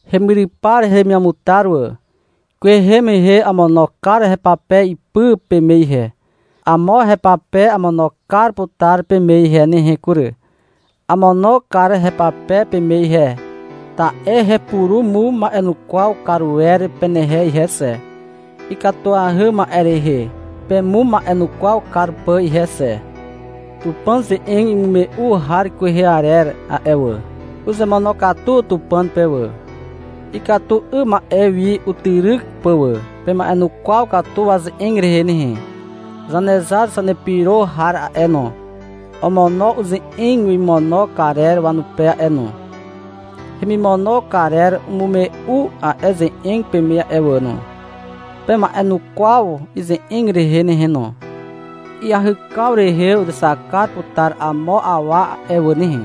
Hemyrypar heremiamutar wà. Kwehe mehe amono kar hepape ipy peme ihe. Amo hepape amono kar putar peme ihe nehe kury. Amono kar hepape peme ihe, ta'e hepurumuma'enukwaw kar wer penehe ihe xe, ikatuahy ma'e rehe pemuma'enukwaw kar pà ihe xe. Tupàn ze'eg imume'u har kwehe arer a'e wà, uzemonokatu Tupàn pe wà, ikatu 'ym ma'e wi utyryk pà wà. Pema'enukwaw katu waze'eg rehe nehe. Zanezar zanepyro har a'e no, omono uze'eg wemimono karer wanupe a'e no. Hemimono karer umume'u a'e ze'eg peme a'e wà no. Pema'enukwaw ize'eg rehe nehe no. Iahykaw rehe uzexak kar putar amo awa a'e wà nehe.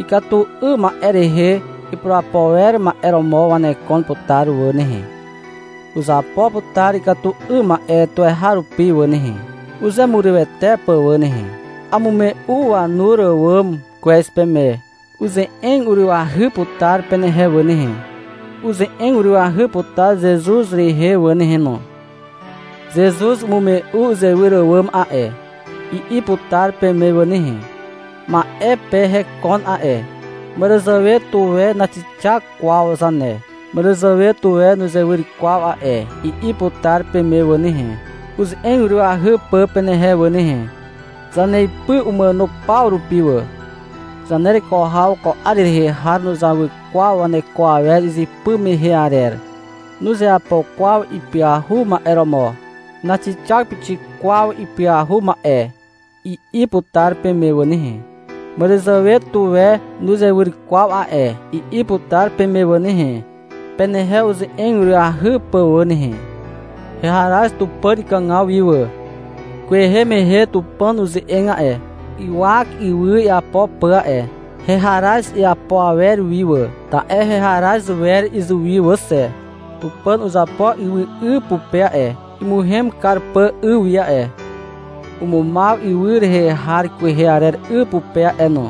Ikatu 'ym ma'e rehe ipurapo wer ma'e romo wanekon putar wà nehe. Uzapo putar ikatu 'ym ma'e tuweharupi wà nehe, uzemurywete pà wà nehe. Amume'u wanur àwàm kwez peme. Uze'eg urywahy putar penehe wà nehe, uze'eg urywahy putar Zezuz rehe wà nehe no. — Zezuz umume'u uzewyr àwàm a'e, i'i putar peme wà nehe. — Ma'e pe hekon a'e, màràzàwe tuwe naxixak kwaw zane, màràzàwe tuwe nuzewyr kwaw a'e, i'i putar peme wà nehe, uze'eg urywahy pà penehe wà nehe. — Zaneipy umàno paw rupi wà. Zanereko haw ko 'ar rehe har nuzawy kwaw waneko awer izypy mehe arer. Nuzeapo kwaw ipyahu ma'e romo. Naxixak pixik kwaw ipyahu ma'e, i'i putar peme wà nehe. — Màràzàwe tuwe nuzewyr kwaw a'e, i'i putar peme wà nehe, penehe uze'eg urywahy pà wà nehe. Heharaz Tupàn ikàgaw wi wà. Kwehe mehe Tupàn uze'eg a'e, ywak ywy iapo pà a'e. Heharaz iapo awer wi wà, ta'e heharaz wer izuwi wà xe. Tupàn uzapo ywy 'y pupe a'e, imuhem kar pà 'y wi a'e. Umumaw ywy rehe har kwehe arer 'y pupe a'e no.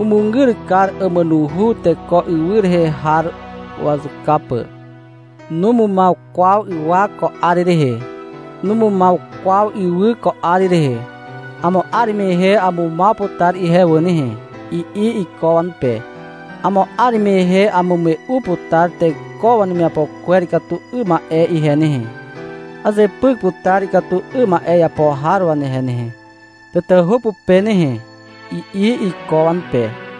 Umugyr kar àmànuhu, teko ywy rehe har wazuka pà. Numumaw kwaw ywak ko 'ar rehe. Numumaw kwaw ywy ko 'ar rehe. — Amo 'ar mehe amumaw putar ihe wà nehe, i'i iko wanupe. — Amo 'ar mehe amume'u putar teko wanemiapo kwer ikatu 'ym ma'e ihe nehe. Azepyk putar ikatu 'ym ma'e iapo har wanehe nehe, tatahu pupe nehe, i'i iko wanupe.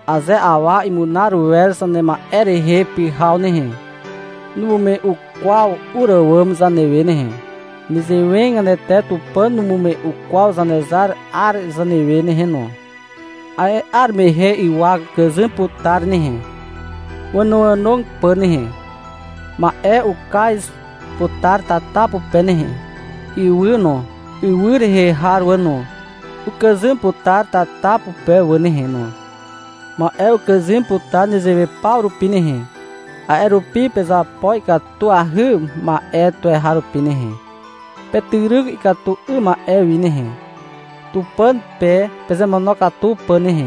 Aze awa imunar wer zanema'e rehe pyhaw nehe, numume'u kwaw ur àwàm zanewe nehe. Nezewegatete Tupàn numume'u kwaw Zanezar 'ar zanewe nehe no. A'e 'ar mehe ywak ukàzym putar nehe, wànoànog pà nehe. Ma'e ukaz putar tata pupe nehe. Ywy no, ywy rehe har wà no, ukàzym putar tata pupe wà nehe no. Ma'e ukàzym putar nezewe paw rupi nehe. A'e rupi, pezapo ikatuahy ma'e tuweharupi nehe. Petyryk ikatu 'ym ma'e wi nehe, Tupàn pe pezemonokatu pà nehe.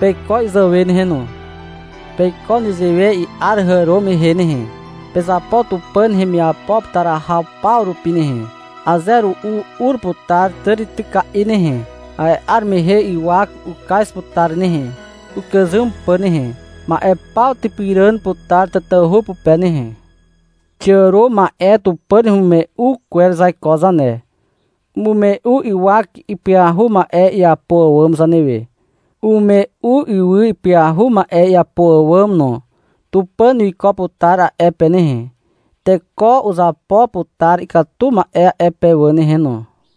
Peiko izàwe nehe no. Peiko nezewe i'ar hàro mehe nehe. Pezapo Tupàn hemiapo putar haw paw rupi nehe. Aze ru'u ur putar tàrityka'i nehe. A'e 'ar mehe ywak ukaz putar nehe, ukàzym pà nehe. Ma'e paw typyràn putar tatahu pupe nehe. Xiàro ma'e Tupàn hemimume'u kwer zaiko zane. Umume'u ywak ipyahu ma'e iapo àwàm zanewe, umume'u ywy ipyahu ma'e iapo àwàm no. Tupàn wiko putar a'e pe nehe. Teko uzapo putar ikatu ma'e a'e pe wà nehe no.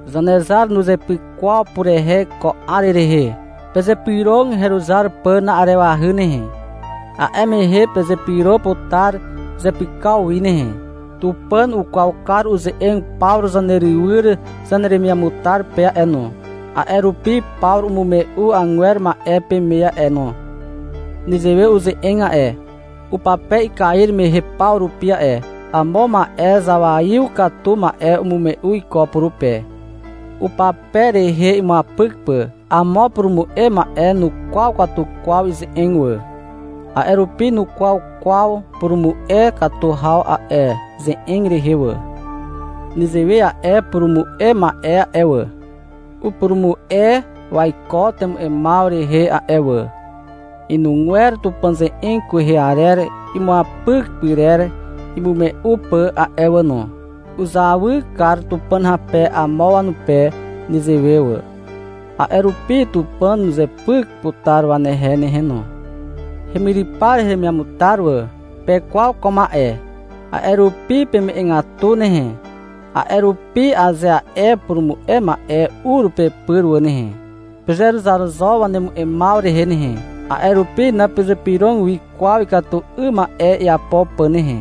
Zanezar nuzepyk kwaw purehe ko 'ar rehe. Pezypyrog heruzar pà na'arewahy nehe. A'e mehe pezepyro putar zepykaw wi nehe. Tupàn ukwaw kar uze'eg Pawru zanerywyr zaneremiamutar pe a'e no. A'e rupi Pawru umume'u agwer ma'e peme a'e no. Nezewe uze'eg a'e, upape ikair mehe paw rupi a'e. Amo ma'e zawaiw katu ma'e umume'u iko purupe, upape rehe imuapyk pà. Amo purumu'e ma'e nukwaw katu kwaw ize'eg wà. A'e rupi nukwaw kwaw purumu'e katu haw a'e ze'eg rehe wà. Nezewe a'e purumu'e ma'e a'e wà, upurumu'e waiko temu'emaw rehe a'e wà, inugwer Tupàn ze'eg kwehe arer imuapyk pyrer imume'u pà a'e wà no. Uzawy kar Tupàn hape amo wanupe nezewe wà. A'e rupi Tupàn uzepyk putar wanehe nehe no. Hemyrypar heremiamutar wà. Pekwaw ko ma'e. A'e rupi peme'egatu nehe. A'e rupi aze a'e purumu'e ma'e ur pepyr wà nehe, pezeruzar zo wanemu'emaw rehe nehe. A'e rupi napezypyrog wi kwaw ikatu 'ym ma'e iapo pà nehe.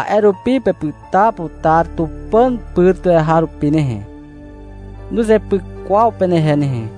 A'e rupi pepyta putar Tupàn pyr tuweharupi nehe. Nuzepyk kwaw penehe nehe.